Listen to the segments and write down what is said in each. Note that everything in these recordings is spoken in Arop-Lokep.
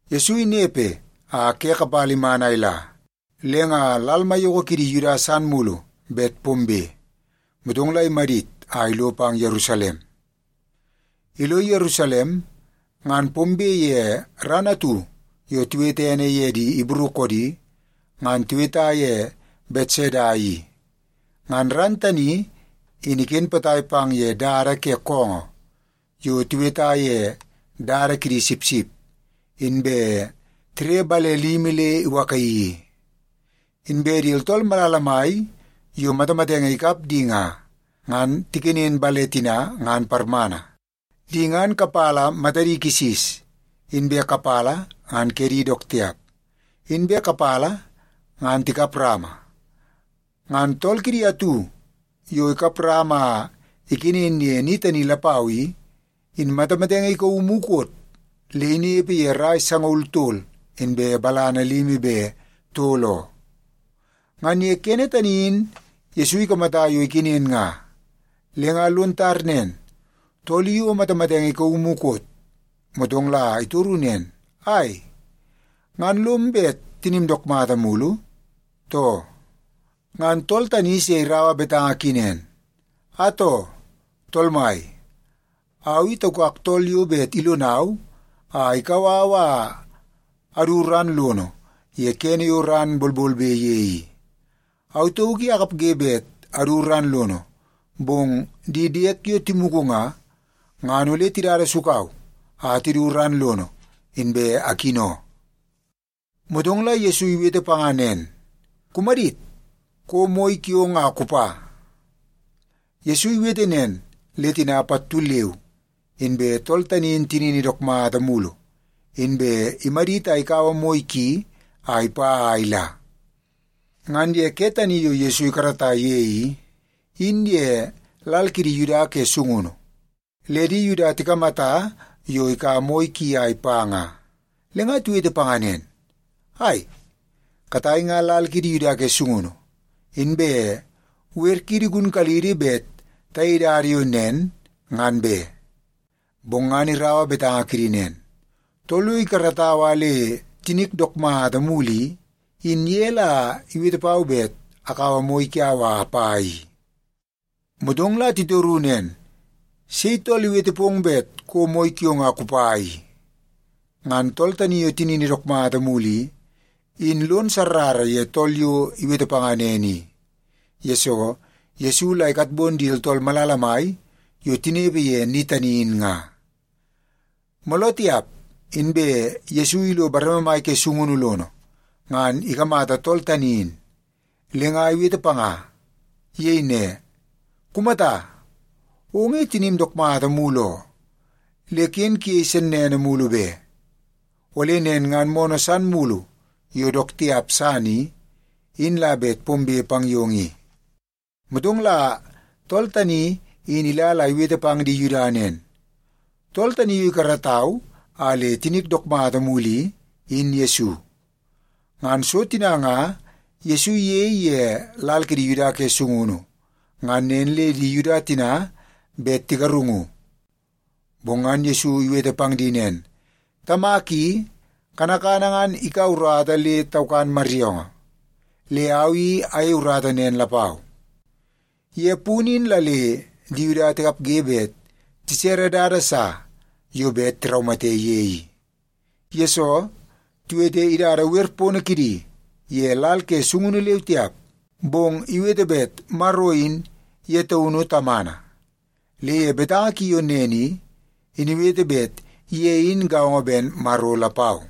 Yesu inepe a ke kapala iman a ila, le nga lal maiyoko kidi Yuda san mulu bet pombe, motong la imadit a ilo pang Yerusalem. Ilo Yerusalem, ngan pombe ye ran atu yo tiwete ene ye di Ibru koodi, ngan tiweta ye Betseda i. Ngan ran tani in iken potai pang ye dada ke koongoo yo tiweta ye Dada Kidi Sipsip, inbe tire bale limi le iwakaii i. Inbe di tooltool malala mai yo matamatenge ikap di nga, ngan tikenen bale tina ngan parmana. Di ngan kapala matadi kisis, inbe kapala ngan kedi dook tiap, inbe kapala ngan tikap rama. Ngan tool kidi atu yo ikap rama a ikenen ye ni tani lapau i, in matamatenge ikauu mukot le inepe ye rai sangaul tol inbe balana limi be tol oo. Ngan ye kene tani in Yesu ikamata yo ikenen nga, le nga lon tar nen tool i o matamatenge ikauu mukot. Motong la itoru nen, “Ai, ngan lom bet tinim dook mulu, too?” Ngan tool tani se iraua betanga ki nen, “Atoo, tool mai, au i taukak tool yo bet ilonau a ikau au a adu ran lono ye kene yo ran bolbolbe ye i. Au tauk i akapge bet adu ran lono, bong di diek yo timugu nga, ngan ole tidada sukau a tidu ran lono, inbe akino.” Motong la Yesu iwete panga nen, “Kumadit! Kouo moi kiong a kupa.” Yesu iwete nen, le tina pattu leu inbe tool tani in tinini dook mata mulu, inbe imadit a ikaua moi ki a ipa a ila. Ngan ye ke tani yo Yesu ikarata ye i, in ye lal kidi Yuda ke sungunu, le di Yuda tikamata yo ikaua moi ki a ipa nga, le nga tiwete panga nen, “Ai, katai nga lal kiidi Yuda ke sungunu, inbe wer kiidi igunkalidi bet tayei dada yo nen ngan be.” Bong ngan iraua betanga kidi nen, “Tool yo ikaratau a le tinik dook mata mulu i, in ye la iwete pau bet akaua moi kiau a apa i.” Motong la titoru nen, “Sei tool iwete pong bet kouo moi kiong a kupa i?” Ngan tool tani yo tinini dook mata mulu i, in lon sarrara ye tool yo iwete panga nen i, yesoo Yesu la ikatbon di tooltool malala mai yo tinepe ye ni tani in nga. Mooloo tiap, inbe Yesu ilo bareme mai ke sungunu lono, ngan ikamata tool tani in, le nga iwete panga. Iyei ne, “Kumata! Ong i tinim dook mata mulu oo. Le ken kuyei sennene mulu be. Ole nen ngan moonoo san mulu yo dook tiap san i, in la bet pombe pang yong i.” Motong la tool tani in ila la iwete pang di Yuda nen, “Tool tani yo ikaratau a le tinik dook mata mulu i, in Yesu.” Ngan so tina nga Yesu iyei ye lal kidi Yuda ke sungunu, ngan nen le di Yuda tina bet tigarungu. Bong ngan Yesu iwete pang di nen, “Tamak i, kanakana ngan ikaua urata le taukan maryoongoo. Le au i ayei urata nen lapau.” Ye punu in la le di Yuda tikapge bet tisere dada sa yo bet tiraumate ye i. Yesoo, tiwete idada wer pono kidi ye lal ke sungunu leu tiap, bong iwete bet Maro in ye taunu Tamana. Le ye betanga ki yo nen i, in iwete bet ye in gaongo ben Maro lapau.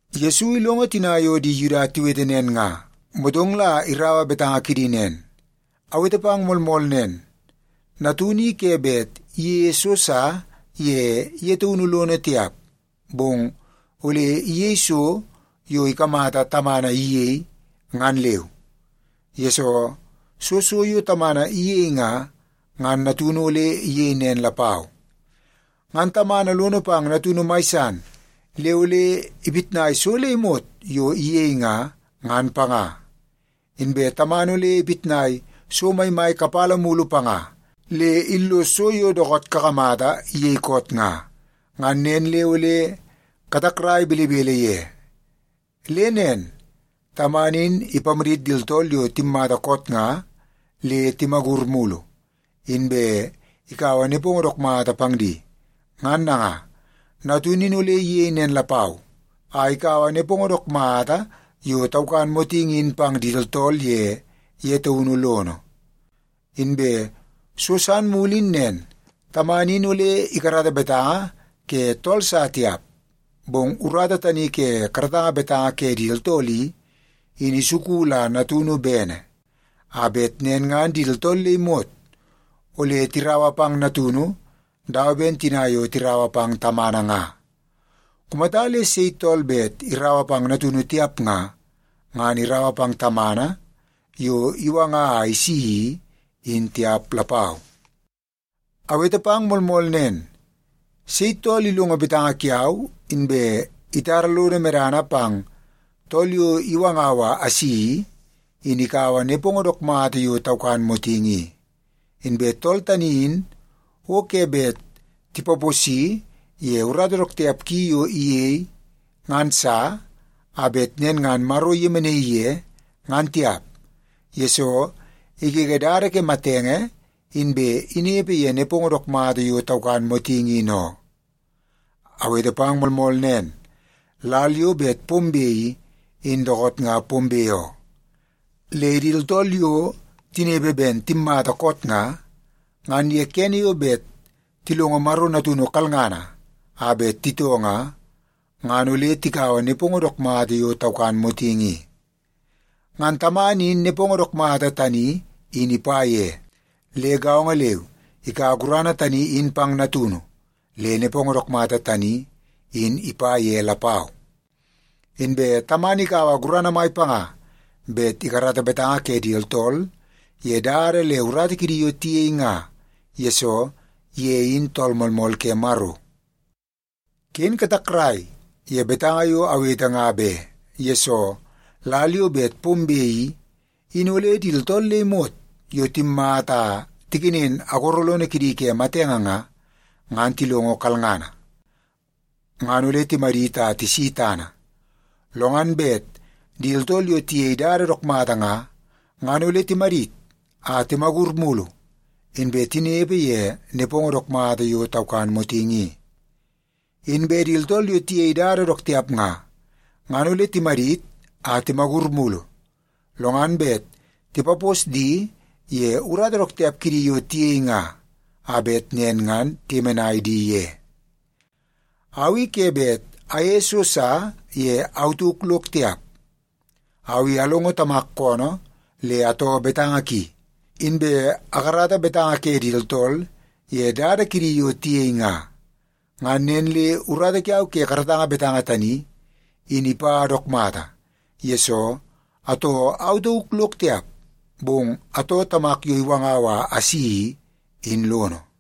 Yesu ilongo tina yo di Yuda tiwete nen nga, motong la iraua betanga kidi nen, “Awete pang moolmool nen, Natunu i ke bet iyeie so sa ye ye taunu lono tiap, bong ole iyei so yo ikamata Tamana iyei, ngan leu. Yesoo, soo so yo Tamana iyei nga, ngan Natunu ole iyei nen lapau. Ngan Tamana lono pang Natunu mai san le ole ipitnai so le imot yo iyei nga, ngan panga. Inbe Tamana ole ipitnai so maimai kapala mulu panga le illos so yo dookoot kakamata iyei koot nga. Ngan nen le ole katakrai belebele ye. Le nen, Tamana in ipamadit di tooltool yo timmata koot nga le timagur mulu, inbe ikaua nepongo dook mata pang di. Ngan nanga, Natunu ole iyei nen lapau a ikaua nepongo dook mata yo taukan motingi in pang di tooltool ye ye taunu lono. Inbe so san mulu in nen, Tamana in ole ikarata betanga ke tool sa tiap, bong urata tani ke karatanga betanga ke di tooltool i, in isuku la Natunu bene, a bet nen ngan di tooltool le imot ole tiraua pang Natunu dawa ben tina yo tiraua pang Tamana nga. Kumata le sei tool bet iraua pang Natunu tiap nga, ngan iraua pang Tamana yo iwanga a isi i, in tiap lapau.” “Awete pang moolmool nen, sei tool ilongo betanga kiau, inbe itara lono medana pang tool yo iwangau a asi i, in ikaua nepongo dook mata yo taukan motingi i. Inbe tool tani in o ke bet tipaposi ye urata dook tiap ki yo iyei ngan sa, a bet nen ngan Maro iyemenaii ye, ngan tiap, yesoo igege dada ke matenge inbe inepe ye nepongo dook mata yo taukan motingi in oo. Awete pang moolmool nen, lal yo bet pombe i, in dookoot nga pombe oo. Le di tooltool yo tinepe ben timmata koot nga, ngan ye kene yo bet tilongo Maro Natunu kalngana a bet titoo nga, ngan ole tikaua nepongo dook mata yo taukan motingi i. Ngan Tamana in nepongo dook mata tani in ipa ye. Le gaongo leu ikaua gurana tani in pang Natunu le nepongo dook mata tani in ipa ye lapau. Inbe Tamana ikaua gurana mai panga bet ikarata betanga ke di tooltool ye dada le urata kidi yo tiyei nga, yesoo ye in Tool Moolmool ke Maro. “Ken katakrai ye betanga yo awete nga be. Yesoo, lal yo bet pombe i, in ole di tooltool le imot yo timmata a tikenen agoro lono kidi ke matenge nga, ngan tilongo kalngana, ngan ole timadit a tisi tana. Lo ngan bet di tooltool yo tiyei dada dook mata nga, ngan ole timadit a timagur mulu inbe tinepe ye nepongo dook mata yo taukan motingi i. Inbe di tooltool yo tiyei dada dook tiap nga, ngan ole timadit a timagur mulu, lo ngan bet tipapos di ye urata dook tiap kidi yo tiyei nga, a bet nen ngan tiyemenai di ye. Au i ke bet ayeie so sa ye au tauk lok tiap. Au i alongo Tamak koonoo le atoo betanga ki, inbe akarata betanga ke di tooltool ye dada kidi yo tiyei nga. Ngan nen le urata kiau ke karatanga betanga tani, in ipa dook mata, yesoo atoo au tauk lok tiap, bong atoo Tamak yo iwangau a asi i, in lono.”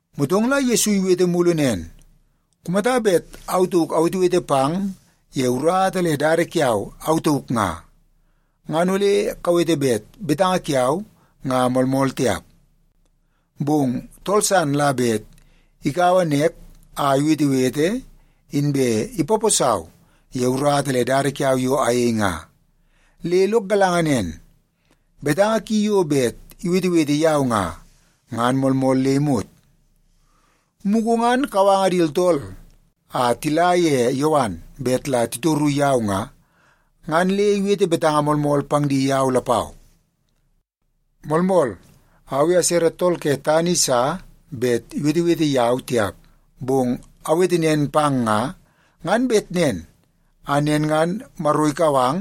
Motong la Yesu iwete mulu nen, “Kumata bet au tauk awetewete pang ye urata le dada kiau au tauk nga, ngan ole kawete bet betanga kiau nga moolmool tiap. Bong tool san la bet ikaua nek a iwetewete, inbe ipaposau ye urata le dada kiau yo ayei nga. Le lok galanga nen, betanga ki yo bet iwetewete yau nga, ngan moolmool le imot. Mugu ngan kawanga di tooltool a tila ye Yowan bet la titor yau nga, ngan le iwete betanga moolmool pang di yau lapau. Moolmool, au i asere tool ke tana i sa bet iwetewete yau tiap, bong awete nen pang nga, ngan bet nen a nen ngan Maro ikau ang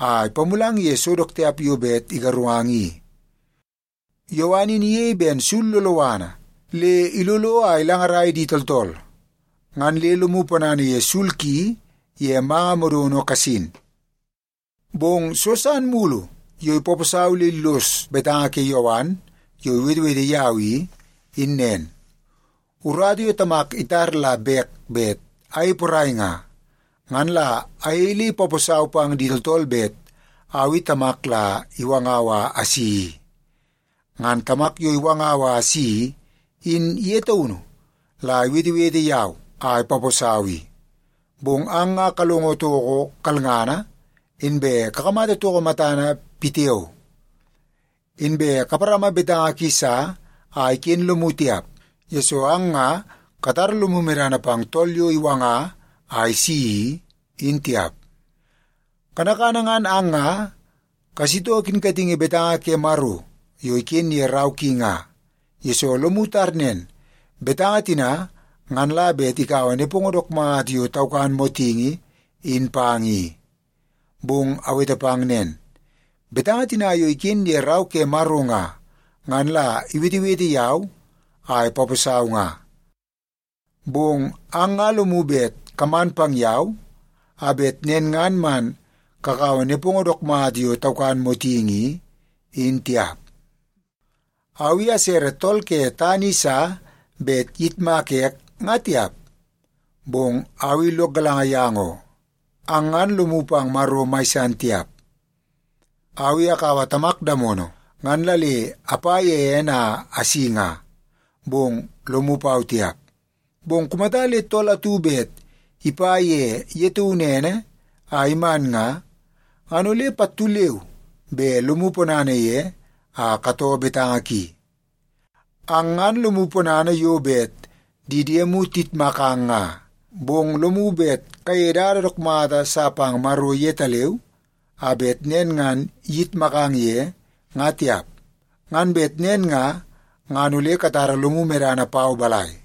a ipamulang ye so dook tiap yo bet igarungang i. Yowan in iyei ben sul loloana le ilolo a ilangarai di tooltool. Ngan le lomu ponana ye sul ki ye manga modono kasin. “Bong so san mulu yo ipaposau le illos betanga ke Yowan yo iwetewete yau i, in nen. Urata yo Tamak itar la bek bet ayei porai nga, ngan la ayei le ipaposau pang di tooltool bet au i Tamak la iwangau a asi i. Ngan Tamak yo iwangau a asi i, in ye taunu la iwetewete yau a ipaposau i. Bong ang nga kalongo toko kalngana, inbe kakamata toko matana pitiao. Inbe kaparama betanga ki sa a iken lomu tiap, yesoo ang nga katara lomu medana pang tool yo iwanga a isi i, in tiap. Kanakana ngan ang nga kasitoo kinkatingi betanga ke Maro yo iken ye rau ki nga, yesoo lomu tar nen, betanga tina ngan la bet ikaua nepongo dook mata yo taukan motingi in pang i. Bong awete pang nen, betanga tina yo iken ye Rau ke Maro nga, ngan la iwetewete yau a ipaposau nga. Bong ang nga lomu bet kaman pang yau, a bet nen ngan man kakaua nepongo dook mata yo taukan motingi i, in tiap. “Au i asere tool ke tana i sa bet iyitmaka ek, nga tiap, bong au i lok galanga yang oo. Ang ngan lomu pang Maro mai san tiap. Au i akaua Tamak damono ngan la le apa ye ene a asi nga, bong lomu pau tiap. Bong kumata le tool atu bet ipa ye ye taunu ene a iman nga, ngan ole pattu leu be lomu ponana ye a katoo betanga ki. Ang ngan lomu ponana yo bet di diemu tiyitmakang nga, bong lomu bet kayeie dada dook mata sa pang Maro yetaleu, a bet nen ngan iyitmakang ye, nga tiap. Ngan bet nen nga, ngan ole katara lomu medana pau balai?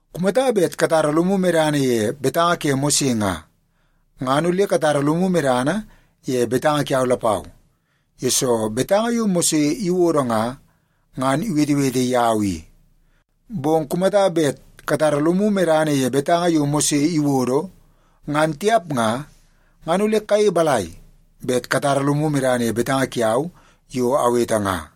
Kumata bet katara lomu medana ye betanga ke Mose nga, ngan ole katara lomu medana ye betanga kiau lapau, yesoo betanga yo Mose iwodo nga, ngan iwetewete yau i. Bong kumata bet katara lomu medana ye betanga yo Mose iwodo, ngan tiap nga, ngan ole kayei balai bet katara lomu medana ye betanga kiau yo awete nga?”